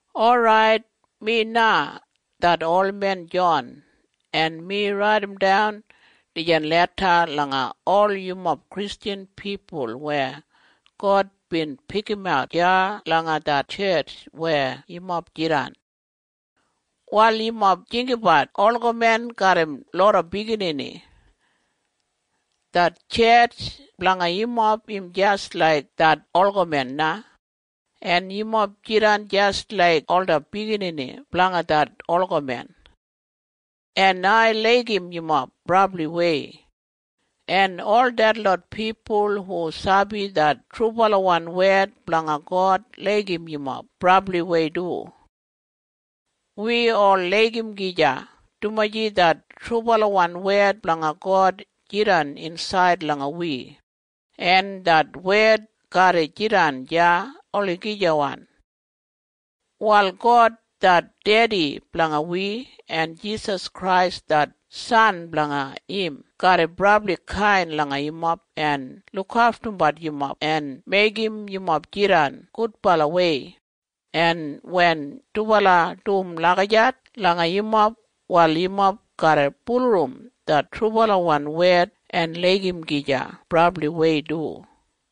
Orait, mi na det olmen Jon, en mi raidimdan dijan leda langa ol yumob Kristjan pipul weya God bin pikimat deya langa det tjetj weya yumob jidan. Wal yumob jinggabat olgamen garram loda biginini. Det tjetj blanga yumob im jis laik det olgamen na, en yumob jidan jis laik ola biginini blanga det olgamen. En ai laigim yumob brabliwei, en ol detlot pipul hu sabi det trubalawan wed blanga God laigim yumob brabliwei du. Wi ol laigim gija, dumaji det trubalawan wed blanga God jidan insaid langa wi, en det wed garra jidan deya olagijawan. Wal God det Dedi blanga wi en Jisas Krais det San blanga im garra brabli kain langa yumob en lukaftumbat yumob en meigim yumob jidan gudbalawei, en wen dubala dum lagijat langa yumob, wal yumob garra bulurrum det trubalawan wed en laigim gija brabliwei du.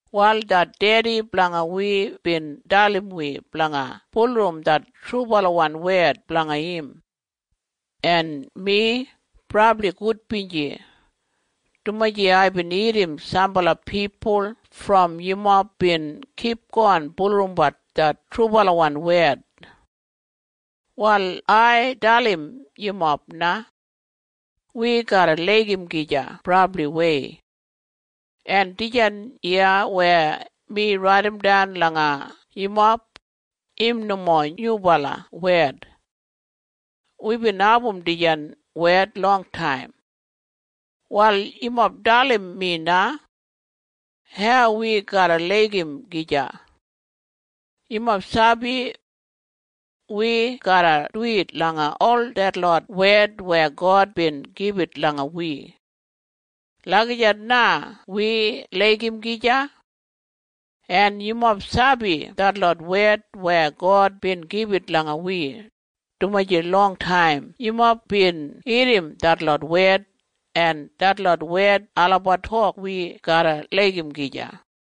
Wal det Dedi blanga wi bin dalim wi blanga bulurrum det trubalawan wed blanga im. En mi brabli gudbinji, dumaji aibin irrim sambala pipul brom yumob bin kipgon bulurrumbat det trubalawan wed. Wal ai dalim yumob na. Wi garra laigim gija brabliwei. En dijan iya weya mi raidimdan langa yumob, im nomo nyubala wed. Wibin abum dijan wed longtaim. Wal yumob dalim mi na. Hau wi garra laigim gija? Yumob sabi? Wi garra duwit langa ol detlot wed weya God bin gibit langa wi. Lagijat na wi laigim gija. En yumob sabi detlot wed weya God bin gibit langa wi, dumaji longtaim yumob bin irrim detlot wed, en detlot wed olabat tok wi garra laigim gija.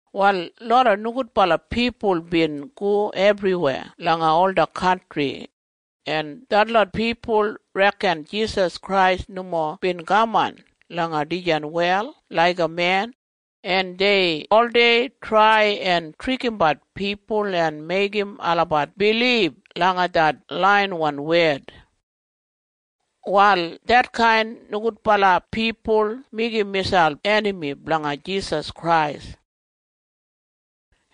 Wal loda nogudbala pipul bin go ebriweya langa ola kantri, en detlot pipul reken Jisas Krais nomo bin kaman langa dijan wel laiga men, en dei oldei trai en trikimbat pipul en meigim olabat bilib langa det laiyawan wed. Wal detkain nogudbala pipul meigim miselp enami blanga Jisas Krais,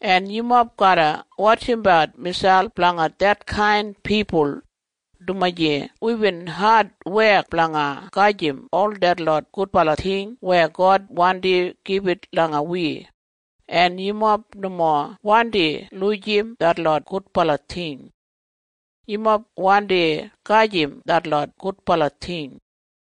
en yumob garra wotjimbat miselp blanga detkain pipul, dumaji wibin adwek blanga gedim ol detlot gudbala ting weya God wandi gibit langa wi, en yumob nomo wandi lujim detlot gudbala ting. Yumob wandi gedim detlot gudbala ting.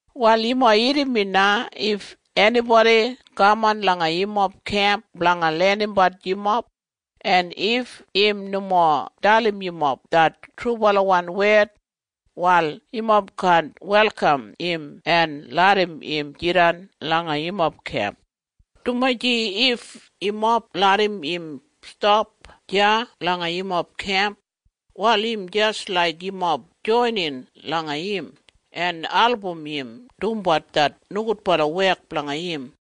Wal yumob irrim mi na. If enibodi kaman langa yumob kemp blanga lenimbat yumob, en if im nomo dalim yumob det trubalawan wed, wal yumob kaan welkam im en larram im jidan langa yumob kemp, dumaji if yumob larram im stap deya langa yumob kemp, wal im jis laik yumob joinin langa im en album im dumbat det nogudbala wek blanga im.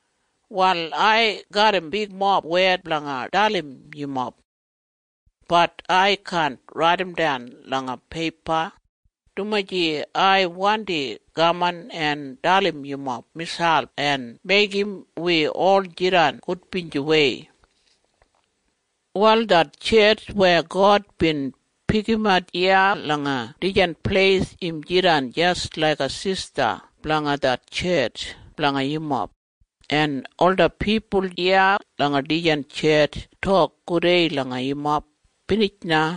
Wal ai garram bigmob wed blanga dalim yumob. Bat ai kaan raidimdan langa peipa, dumaji ai wandi kaman en dalim yumob miselp en meigim wi ol jidan gudbinjiwei. Wal det tjetj weya God bin pikimat iya langa dijan pleis im jidan jis laiga sista blanga det tjetj blanga yumob, en ola pipul iya langa dijan tjetj tok gudei langa yumob. Binij na.